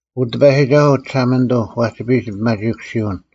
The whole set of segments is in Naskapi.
ᐅ ᑎᐸᔨᒋᒐᓱᐤ ᒋᓴᒪᓂᑐᐤ ᐛᒋᐱᔨᒡ ᓂᐱᒪᒋᐃᑯᓯᐅᓐ,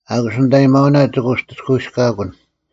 ᐊᑯᔅ ᓂᑦ ᐊᔭᒥᐊᐅᓐ ᒋᑭ ᐅᑎᔅᑲᐎᔅᑲᑯᓐ: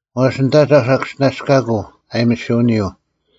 ᐛᔅ ᓂᑦ ᐊᒐᐧᒄ ᓴᑭᔅᒋᓇᔅᑲᑯᐤ ᐊᔨᒥᓯᐅᓂᔪᐤ,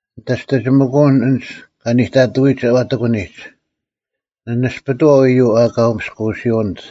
ᓂᑦ ᐊᓯᑕᒋᒥᑯᐅᓐ ᐊᓐᒡ ᑲ ᓂᑕᑐᐎᒡ ᐛᑎᑯᓂᒡ: ᓂ ᓇᔅᐱᑐᐛᐤ ᐃᔪᐤ ᐊᑲ ᐅᒥᔅᑯᐅᓯᐅᓂᑦ;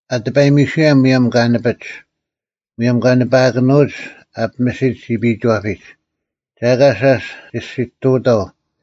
ᐊ ᑎᐸᔨᒥᓱᔭᓐ ᒧᔭᒻ ᑲ ᓂᐱᒡ, ᒧᔭᒻ ᑲ ᓂᐸᐊᑭᓄᐅᒡ ᑲ ᐱᒥᓯᒡ ᒋᐱᐃᒋᐛᐱᒡ, ᒐ ᐊᑲ ᓴᔅ ᒋᔅᒋᑐᐅᑥᐤ: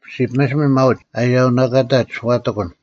ᔅᒋ ᐱᒥᓯᒥᓐ ᒪᐅᒡ ᐊᔭᐅᓇᑲᑕᒡ ᐛᑎᑲᓐ,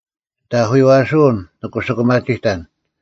ᒋᑦ ᐊᐧᑯᔪᐛᓱᐅᓐ, ᓂ ᑯᓯᑯᒪᒋᑕᓐ,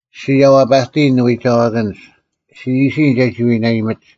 ᔅᒋ ᔭᐛᐸᑎᔨᓐ ᓂᐎᒐᐛᑭᓐᒡ; ᔅᒋ ᐃᓯᔨᓐ ᒐᒋ ᐎᓇᐃᒥᒡ: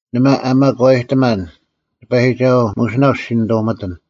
ᓇᒪ ᐊ ᒪᒂᐃᑎᒪᓐ: ᑎᐸᔨᒋᒐᓱᐤ, ᒧᓯᓇᐤ ᔅᒋ ᓇᓂᑐᒥᑎᓐ,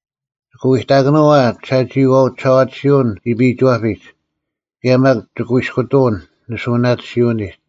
ᒋᑭ ᐎᑕᑭᓄᐤ ᐊ ᒋᓴᒋᐃᐛᐤ ᒋᓴᐛᑎᓯᐅᓐ ᒋᐱᐃᒋᐛᐱᒡ? ᑭᔭ ᒪᒃ ᒋᑯᐃᔅᑯᑐᐅᓐ ᓂᓱᐅᓇᑎᓯᐅᓂᒡ?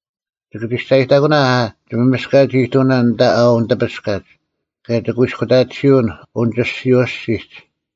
ᒋᑭ ᒋᔅᒐᔨᑕᑯᓇ ᐊ ᒋᒪᒥᔅᑲᒡ-ᐃᑐᐅᓇ ᐊᓐᑕ ᐊ ᐅᓂᑎᐱᔅᑲᒡ? ᑭᔭ ᒋᑯᐃᔅᑯᑕᑎᓯᐅᓐ ᐅᓂᒋᔅᒋᓯᐤ ᐊᔅᒋᒡ?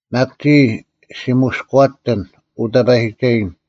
ᒪᒃ ᒋᔾ ᔅᒋ ᒧᔅᑯᐛᑎᑎᓐ, ᐅ ᑕᐸᔨᒋᒐᔭᓐ;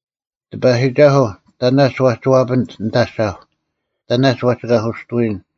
ᑎᐸᔨᒋᒐᓱᐤ, ᑕᓇᒡ ᐛᒋ ᐛᐱᓂᑦ ᓂᑦ ᐊᒐᐧᒄ? ᑕᓇᒡ ᐛᒋ ᑲᓱᔅᑐᐎᔨᓐ?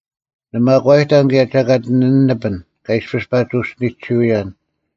ᓂ ᒪᒂᐃᑕᓐ ᑭᔭ ᒐᑲᑦ ᓂ ᓂᐱᓐ ᑲ ᐃᔅᐱᔅ ᐸᒋ ᐅᔅᒋᓂᒋᓱᔭᓐ: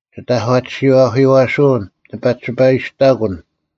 ᒋᑦ ᐊᒂᑎᓯᐤ ᐊᐧᑯᔪᐛᓱᐅᓐ ᓂ ᐸᓯᒋᐸᔨᔅᑕᑯᓐ;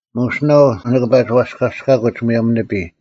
ᒧᓯᓇᐤ ᓂᑭ ᐸᒋ ᐛᔅᑲᔅᑲᑯᒡ ᒧᔭᒻ ᓂᐱᔾ;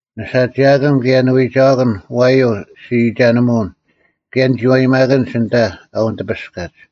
ᓂᓴᒋᐊᑭᓐ ᑭᔭ ᓂᐎᒐᐛᑭᓐ ᐛᔪᐤ ᔅᒋ ᐃᒐᓂᒧᐅᓐ, ᑭᔭ ᓂᒋᔪᐛᒪᑭᓐᒡ ᐊᓐᑕ ᐊ ᐅᓂᑎᐱᔅᑲᔨᒡ᙮